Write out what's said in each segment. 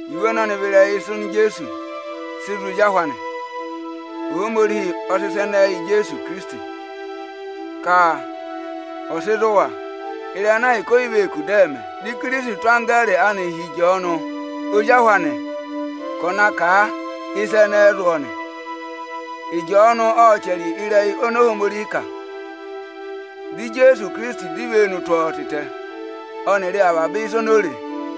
Iwe ọnọnị vị ịrẹyị ịsa oni Ijeesu sị zụ̀ ezi ahụ anị. Ohomorihi ộ sị ịsa ẹnẹnị yị Ijeesu Ohinọyị ọnị Ọ nyị ka ọ̀ dọ yị há, ka ọ̀ sị zụ̀ wa ịrẹyị ana ahịka o yi vee kù dị ẹ̀ mẹ. Di Ikirisiti tụ́ anggẹẹrị anị hi Ịjọọnụ ozi ahị anị ka ọ̀ na sị ịsa ẹnẹẹ zụ̀ ọọ nị. Ịjọọnụ ộ chẹrẹ ịrẹyị oni Ohomorihi kà, di Ijeesu Ikirisiti dọ ivenu tụ́ ọọ tịtẹ, ọnịrị avaba ịsa oni o re.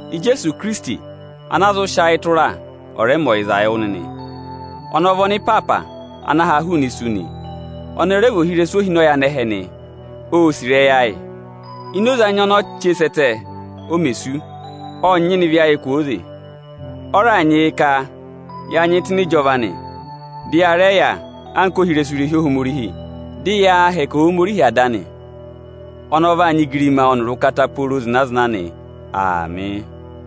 Ijeesu Ikirisiti, ana a zụ sị ayị tụra, ọ̀ rẹ mẹ ọyịza wụ nịnị. Ọnị ọ vị ọnịpaapa ana ha hụụnị isu nị, ọnị ọ rẹ vị ohirẹsụ ohinọyị anẹhẹ nị. Ô sì ịrẹyị ayị. Ini oze anya oni o che sẹ́ ẹtẹ o mè sú, ộ nyịna ịvị ayị kwooze. Ọ raà nyị yị ka ya nyị tụ́ ịnị ịjọva anị, dị ya rẹ yà anka ohirẹsụ irehi Ohomorihi, dị yaa hẹkẹ Ohomorihi Ada anị. Ọnị ọ vaa nyị igirima ọnịrị ụkata pooro zịna-zịna nị. Aamị.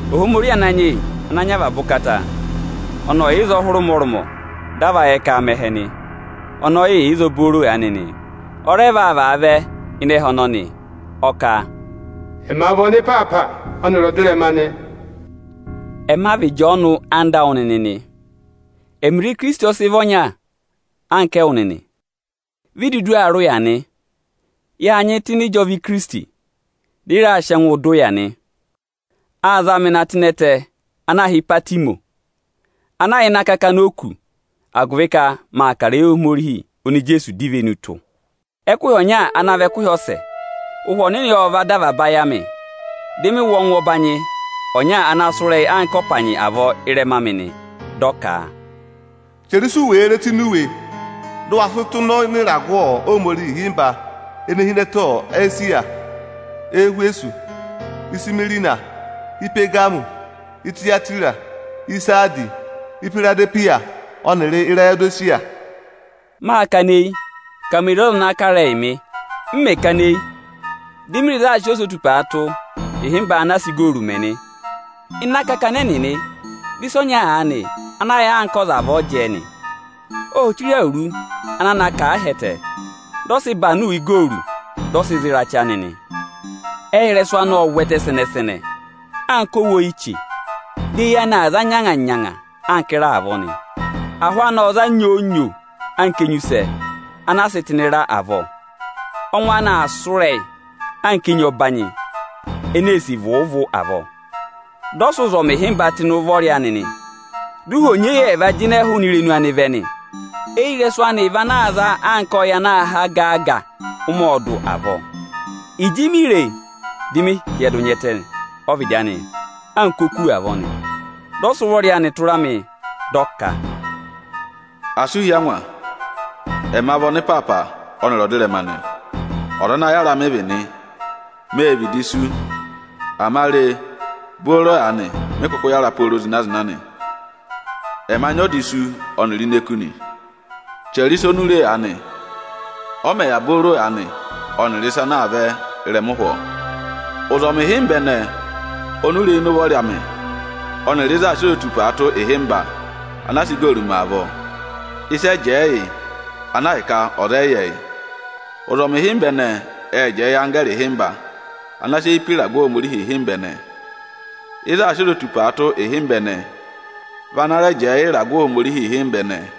Ohomorihi Ananyị yị Ochẹtẹngụ, ọnị ọ yà ịzọọ hụrẹ ụmọrụmọ dị a va yẹ aa mẹ ẹhẹ nị. Ọnị ọ yị yà ịzọọ booro aanị nị, ọ rẹ vaa vaa vẹ ịnị ẹhẹ ọnọnị. Ọ kà, Ọnị ọ vị ọnịpaapa ọnịrị ọdịrẹma nị. Ẹma vị Ịjọọnụ ọyịnyara awụ nịnị nị. Ẹmịrị Ikirisiti ọ sị vị ọnya anka ẹwụ nịnị: vi i dudu aa rị ụya nị. Yâ nyị tụ́ ịnị ịjọva Ikirisiti, dị ị raa sị ẹngụụ dọ ụya anị nị. Â za mị na tụ́ ịnị ẹtẹ ana yà ịnị akakana òkū ana aā hị́ Ịpatịmọsị, agụvị ka maa kà ịrẹyị Ohomorihi oni Ijeesu dọ ivenu tụ́. Ẹkụhị ọnya ana vị ẹkụhị ọsẹ, Ụhwẹ Ohomorihi ộ va dọ avaba ayị amị. Dị mị wụ́ ọngwẹ ọbanyị ana sụ́ ịrẹyị anka ọpanyị avọọ ị́rẹma amị nị. Dị ọ ka, “Chẹrẹ ịsị u wèe re tụ́ ini iwe, dị ụ wa sị tụ́ nọ ịnị ịragụ Ohomorihi ịhịmba ene hi ịnị ẹtẹ Esiya: Ẹhwẹsọsị, Ịsịmụna, Ipagamụmị, Itiyatira, Isaadisi, Ihwiradehwiya ọnịrị Irayodesiya.” Mâ kana eyi ka me re ọza ana aa kà ịrẹyịị mị. M mẹ̀ kana eyi, di mi re ịzị aā sị ozotupaa tụ́ ịhịmba ana a sị igooru mẹ nị. Ịnị akakana ẹnịnị, dị ịsa ọnya aanị ana sị mẹẹ anka ọza avọọ jẹẹ nị. Ô chire awuru ana na kà a ahẹtẹ, dị ọ sị ịbanụ igooru dị ọ sị za ịrachị anị nị. Ẹyị ịrẹsụ anị ộ zẹtẹ sẹnẹ-sẹnẹ anka owu oyiche. Di eyi anị aa za nyanga-nyanga anka ịra avọọ nị. Ahụ anị aa za nyoo-nyoo anka enyusẹ ana a sị tụ́ ịnị ịra dị aa kụ́ eyi avọọ. Ọngwẹ anị aa sụ́ ịrẹyị anka enyi ọbanyị ene ee sì vụụ-vụụ zina ọwọọrọba avọọ. Dị ọ sị ụzọmị ịhịmba tụ́ ịnị ụvọrị anị nị. Dị ụhwọ onyeyẹva jịnẹ hụụnị irenu anị vẹ nị. Eyirẹsụ anị vị ana aa za anka ọyị ana aa há gaa-gaa ụmẹ ọọdụ avọọ. Ịjị mi re e, dị mị hyẹdụ nya ẹtẹ ọ́vịdị anị anka oku avọọ nị. Dị ọ sị ụvọrị anị tụra mị, dị ọ ka, “Asị ụ hí angwa; ẹma vị ọnịpaapa ọnịrị ọdịrẹma nị. Ọza ana yára mị vị nị. Mê vịdị sú, ama re, booro aanị mị kụkụ yára pooro zịna-zịna nị. Ẹma nyị ọda isu ọnịrị ini eku nị. Chẹrẹ ịsa oni u re aanị, ọ mẹ̀ yà booro aanị ọnịrị ịsa ana aa vẹ ịrẹma ụhwọọ! Ụzọmị ịhịmba ẹnẹẹ oni u re ịnị ụvọrị amị ọnịrị ịzị aā sị ozotupaa tụ́ ịhịmba ana a sị igooru mẹ avọọ, ịsị ẹ jẹẹ yị ana ahịka ọza ọyị yẹ, yị: Ụzọmị ịhịmba ẹnẹẹ ệ jẹẹ yị anggẹẹrị ịhịmba ana sị eyi pe ịragụ Ohomorihi ịhịmba ẹnẹẹ. Ịzị aā sị ozotupaa tụ́ ịhịmba ẹnẹẹ vị ana rẹ jẹẹ yị ịragụ Ohomorihi ịhịmba ẹnẹẹ.”